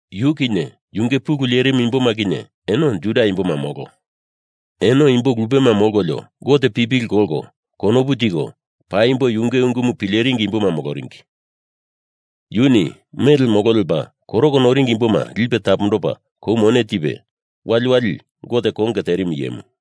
Yu kinye yunge pulu lerimu imboma kinye eno Judia imboma molo. Eno imbo lupema molkolio Gote pipili kolko konopu tiko paimbo yunge ungumu pileringi imboma moloringi. Yuni mele molo lepa koroko noringi imboma lipe tapondopa kou mone tipe, waliwali Gote konge terimu iyemu.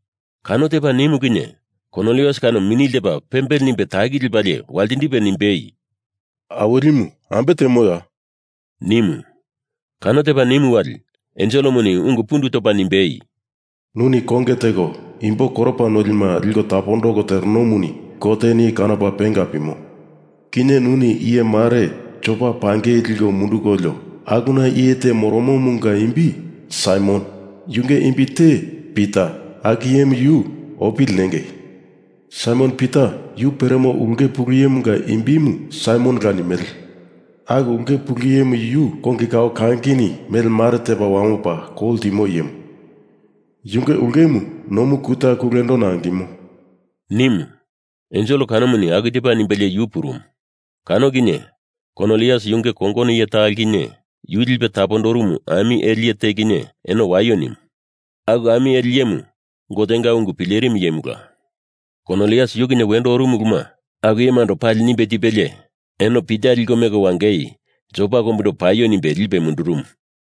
Kano tepa nimu kinye Kornilius kano mini ltepa pembele nimbe taki lepalie waltindipe nimbei, “Awilimu, ambe temoya?” nimu. Kano tepa nimu wali enselemuni ungu pundu topa nimbei, “Nuni konge teko imbo koropa nolima liko tapondoko terenomuni Goteni kanopa penga pimo. Kinye nuni iye mare Jopa pangei liko mundukolio akuna iye te moromomunga imbi Saimon yunge imbi te Pita aku iyemu yu opili nengei. Saimon Pita yu peremo ulke pulu iyemunga imbimu Saimonola nimele. Aku ulke pulu iyemu yu kongi kao kangini mele mare tepa wamopa kou ltimo iyemu. Yunge ulkemu nomu kuta kulendona angimo,” nimu. Ensel kanomuni aku tepa nimbelie yu purumu. Kano kinye Korniliusini yunge kongono iye talo kinye yu lipe tapondorumu ami ele iye te kinye eno waio nimu. Aku ami ele iyemu Gotenga ungu pilerimu iyemula. Kornilius yu kinye wendo orumu uluma aku iyemando pali nimbe tipelie eno Pita liko meko wangei Jopa kombundo paio nimbe lipe mundurumu.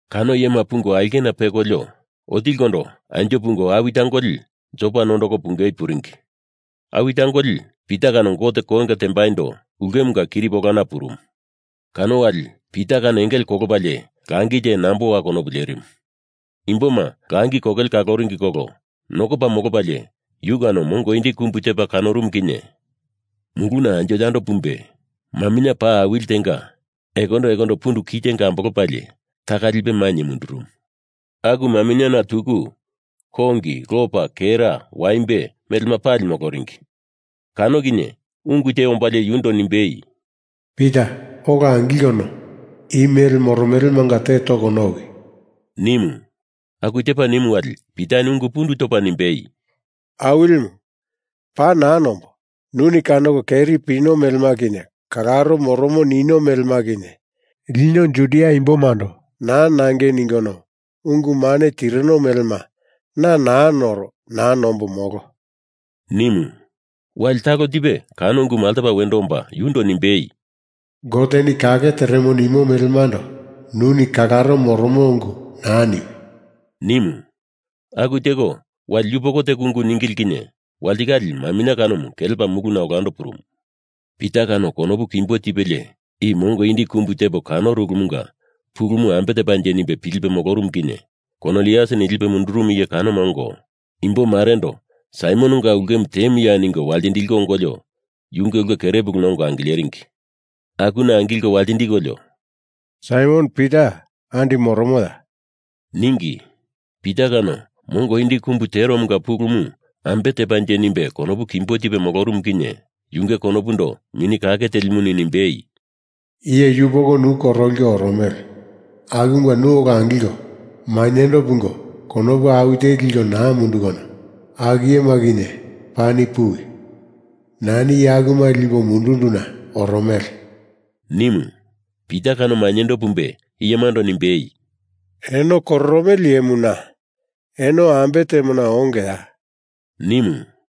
Kano iyema pungo ulkena pekolio, otilikondo anjo pungo awi tangoli Jopa nondoko pungei puringi. Awi tangoli Pita kano Gote konge tembaindo ulkemunga kiripi olana purumu. Kano wali Pita kano engele kolopalie langi te nambowa konopu lerimu. Imboma langi kokele kaloringi kolo nokopa molopalie yu kano mongo indi kumbu tepa kanorumu kinye, muluna anjo yando pumbe, maminye paa awili tenga ekondo ekondo pundu kitenga ambolopalie taka lipe mainye mundurumu. Aku maminyena tuku kongi lopa kera waimbe melema pali moloringi. Kano kinye ungu te ombalie yundo nimbei, “Pita ola angilkono i mele moromelemanga te toko nowi,” nimu. Aku tepa nimu wali Pitani ungu pundu topa nimbei, “Awilimu, paa naa nombo. Nuni kanoko keri pino melema kinye kalaro moromo nino melema kinye lino Judia imbomando naa nangei ningono ungu mane tirino melema na naa noro naa nombo molo,” nimu. Wali talo tipe kano ungumu altopa wendo omba yundo nimbei, “Goteni kake teremo nimo melemando nuni kalaro moromo ungu naa niwi,” nimu. Aku teko, wali yupoko teko ungu ningili kinye walitikale maminye kanomu kelepa muluna olando purumu. Pita kano konopu kimbo tipelie i mongo indi kumbu tepo kanoro ulumunga pulumu ambe tepanje nimbe pilipe moloromu kinye Korniliusini lipe mundurumu iye kanoma ongo imbo marendo Saimononga ulkemu temuya ningo waltindiliko ongolio yunge ulke kere puluna ongo angileringi. Akuna angilko waltindikolio “Saimon Pita andi moromoya?” ningi. Pita kano mongo indi kumbu teromunga pulumu ambe tepanje nimbe konopu kimbo tipe molorumu kinye yunge konopundo Mini Kake Telimuni nimbei, “Iye yupoko nu koroliko oromele. Akumunga nu ola angilko mainyendo pungo konopu awi teli liko naa mundukono aku iyema kinye pani puwi! Nani iye akuma lipo mundunduna oromele,” nimu. Pita kano mainyendo pumbe iyemando nimbei, “Eno kororomele iyemu na. Eno ambe temona ongeya?” nimu.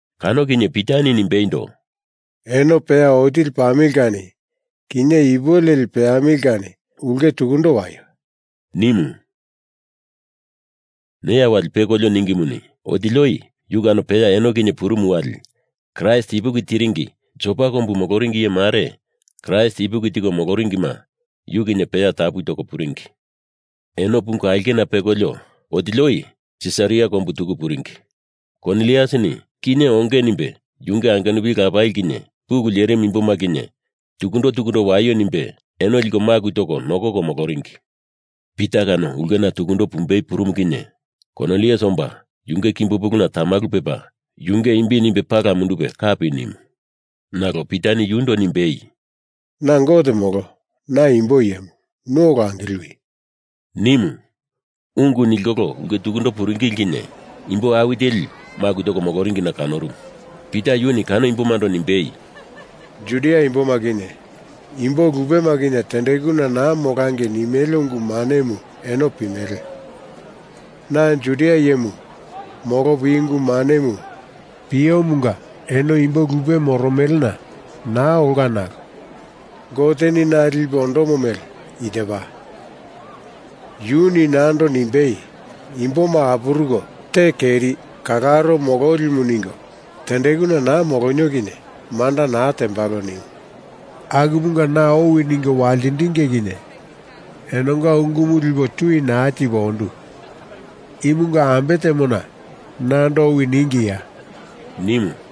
Kano kinye Pitani nimbeindo, “Eno peya otili pamili kani kinye ipu leli i peamili kani ulke tukundo waio,” nimu. Neya wali pekolio ningimuni otili oi yu kano peya eno kinye purumu wali Kraist ipuki tiringi Jopa kombu moloringi iye mare Kraist ipuki tiko moloringima yu kinye peya tapu toko puringi. Eno pungo aulkena pekolio, otili oi Sisaria kombu tuku puringi. Korniliusini kinye onge nimbe yunge angenupili lapali kinye pulu lerimu imboma kinye tukundo tukundo waio nimbe eno liko maku toko nokoko moloringi. Pita kano ulkena tukundo pumbei purumu kinye Kornilius omba yunge kimbo puluna tamalu pepa yunge imbi nimbe pala mundupe kapi nimu. Nalo Pitani yundo nimbei, “Na Gote molo, na imbo iyemu. Nu ola angiliwi,” nimu. Ungu nilkolo ulke tukundo puringili kinye imbo awi teli maku toko moloringina kanorumu. Pita yuni kano imbomando nimbei, “Judia imboma kinye imbo lupema kinye tendekuna naa molangei nimele ungu manemu eno pimele. Na Judia iyemu molopo i ungu manemu piomunga eno imbo lupe moromelena naa olka nalo Goteni na lipe ondomo mele i tepa, yuni nando nimbei, ‘Imboma apuruko te keri, kalaro mololimu ningo tendekuna naa molonio kinye manda naa tembalo,’ nimu. Akumunga na owi ningo waltindinge kinye enonga ungumu lipo tui naa tipo ondu. Imunga ambe temona nando owi ningiya?” nimu.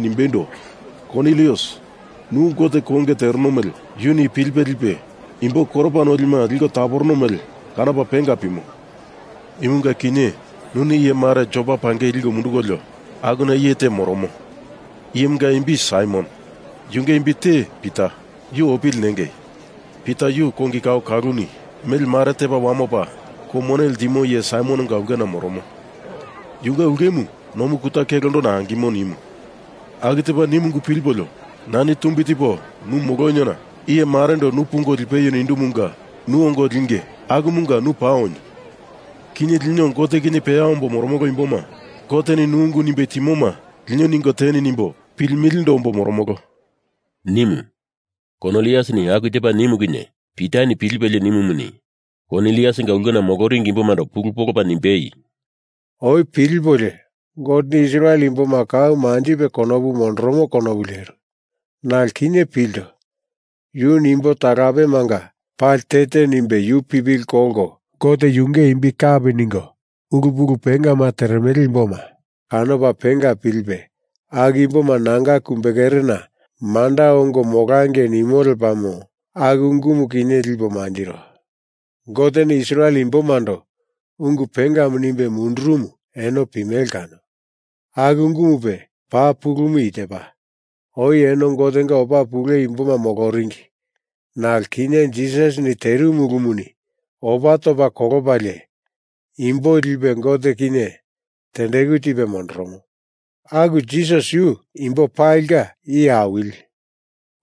nimbeindo, ‘Kornilius nu Gote konge tereno mele yuni pilipe lipe, imbo koropa nolima liko taporono mele kanopa penga pimo. Imunga kinye nuni iye mare Jopa pangei liko mundukolio, akuna iye te moromo, iyemunga imbi Saimon, yunge imbi te Pita. Yu opili nengei. Pita yu kongi kao kaluluni mele mare tepa wamopa kou mone ltimo iye Saimononga ulkena moromo, yunge ulkemu nomu kuta kulendona angimo,’ nimu. Aku tepa nimu ungu pilipolio nani tumbi tipo nu moloniona iye marendo nu pungo lipeio nindumunga nu ongo linge akumunga nu paa onio. Kinye lino Gote kinye peya ombo moromolo imboma Goteni nu ungu nimbe timoma lino ningo teni nimbo pilimilindo ombo moromolo,” nimu. Korniliusini aku tepa nimu kinye Pitani pilipelie nimumuni, Korniliusinga ulkena moloringi imbomando pulu polopa nimbei, “Oi pilipolio Goteni Israel imboma kau manjipe konopu mondoromo konopu leru. Nalo kinye pilto, yuni imbo talapemanga pali te te nimbe yu pipili kolko Gote yunge imbi kape ningo ulu pulu pengama teremele imboma kanopa penga pilipe aku imboma nanga kumbekerena manda ongo molangei nimo lepamo, aku ungumu kinye lipo mantiro. Goteni Israel imbomando ungu pengama nimbe mundurumumu eno pimele kano. Aku ungumupe paa pulumu i tepa, oi eno Gotenga opa pule imboma moloringi. Nalo kinye Jisasini terimu ulumuni opa topa kolopalie imbo lipe Gote kinye tendeku tipe mondoromo. Aku Jisas yu imbo palinga Iye Awili.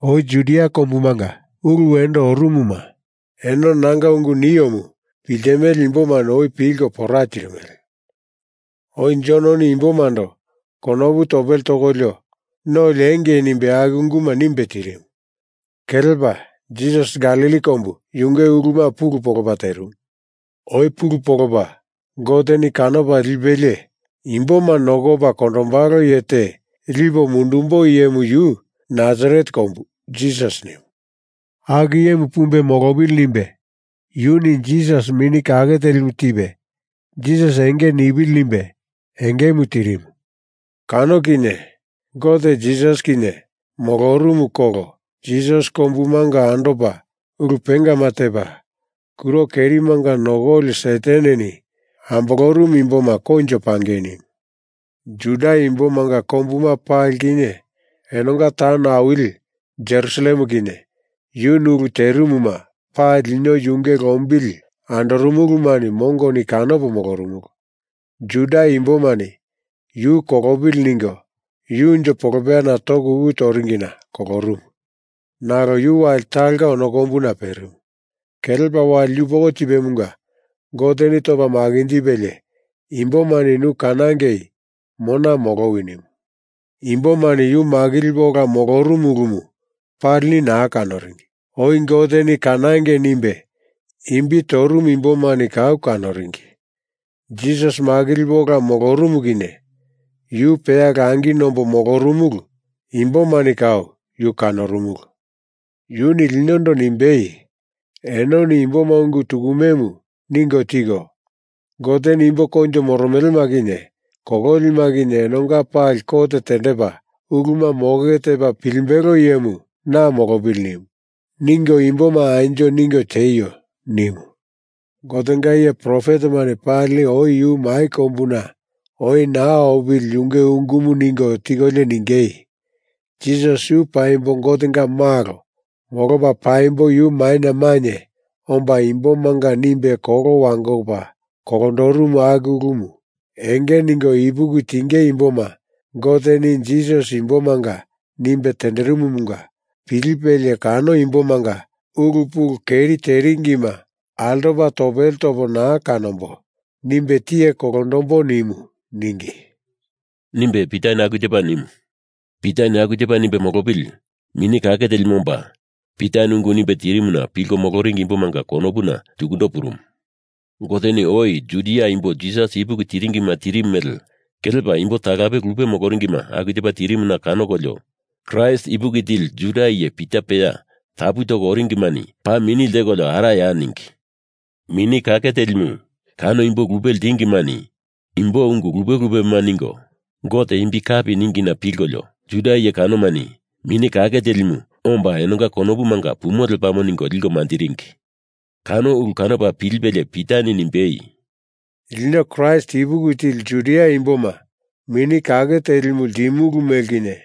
Oi Judia kombumanga ulu wendo orumuma eno nanga ungu niomu piltimele imbomani oi pilko pora tirimele. Oi Jononi imbomando konopu topele tokolio no liengei nimbe aku unguma nimbe tirimu. Kelepa Jisas Galili kombu yunge uluma pulu polopa terimu. Oi pulu polopa Goteni kanopa lipelie imboma nokopa kondombalo iye te lipo mundumbo iyemu yu Nasaret kombu Jisas nimu. Aku iyemu pumbe molopili nimbe, yuni Jisas Mini Kake Telimu tipe Jisas enge nipili nimbe engemu tirimu. Kano kinye Gote Jisas kinye molorumu kolo Jisas kombumanga andopa ulu pengama tepa, kuro kerimanga nokoli Sataneni ambolorumu imboma koinjo pangei nimu. Juda imbomanga kombuma pali kinye enonga taun awili Jerusalem kinye yuni ulu terimuma pali lino yunge lombili andorumulumani mongoni kanopo molorumulu. Juda imbomani yu kolopili ningo yu unjo polopeyana toko uku toringina kolorumu. Nalo yu wali talonga ono kombuna perimu, kelepa wali yupoko tipemunga Goteni topa makinjipelie imbomani nu kanangei mona molowi, nimu. Imbomani yu makilipe ola molorumu ulumu palini naa kanoringi. Oi Goteni kanangei nimbe imbi torumu imbomani kau kanoringi. Jisas makilipe ola molorumu kinye yu peya langi nombo molorumulu imbomani kau yu kanorumulu. Yuni linondo nimbei, ‘Enoni imboma ungu tukumemu ningo tiko, Goteni imbo koinjo moromelema kinye kololima kinye enonga pali kot tendepa uluma moke tepa pilimbelo iyemu na molopili nimu, ningo imboma anjo ningo tieio,’ nimu. Gotenga iye profetemani pali oi yu mai kombuna oi naa opili yunge ungumu ningo tikolio ningei, ‘Jisas yu paimbo Gotenga malo molopa paimbo yu maina mainye omba imbomanga nimbe kolo wangopa kolondorumu aku ulumu enge ningo ipuki tinge imboma Goteni Jisas imbomanga nimbe tenderimumunga pilipelie kano imbomanga ulu pulu keri teringima altopa topele topo naa kanombo nimbe tiye kolondombo nimu,’ ningi,” nimbe Pitani aku tepa nimu. Pitani aku tepa nimbe molopili Mini Kake Telimu omba Pitani ungu nimbe tirimuna pilko moloringi imbomanga konopuna tukundo purumu. Goteni oi Judia imbo Jisas ipuki tiringima tirimu mele kelepa imbo talape lupe moloringima aku tepa tirimuna kanokolio Kraist ipuki tili Judia iye Pita peya tapu toko oringimani paa mini lteko araya ningi. Mini Kake Telimu kano imbo lupe ltingimani imbo ungu lupe lupema ningo Gote imbi kapi ningina pilkolio Juda iye kanomani Mini Kake Telimu omba enonga konopumanga pumo lepamo ningo liko manjiringi. Kano ulu kanopa pilipelie Pitani nimbei, “Lino Kraist ipuki tili Judia imboma Mini Kake Telimu ltimulu mele kinye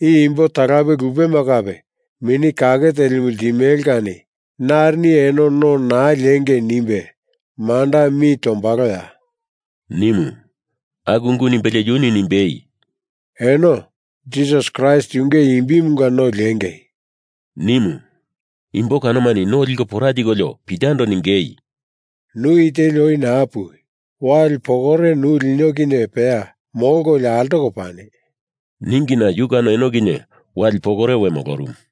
i imbo talape lupema kape Mini Kake Telimu ltimele kani narini eno no naa liengei nimbe manda mi tombaloya?” nimu. Aku ungu nimbelie yuni nimbei, “Eno Jisas Kraist yunge imbimunga no liengei,” nimu. Imbo kanomani no liko pora tikolio Pitando ningei, “Nu i teli oi naa puwi. Wali pokore nu lino kinye peya molkolio altoko pani,” ningina yu kano eno kinye wali pokore we molorumu.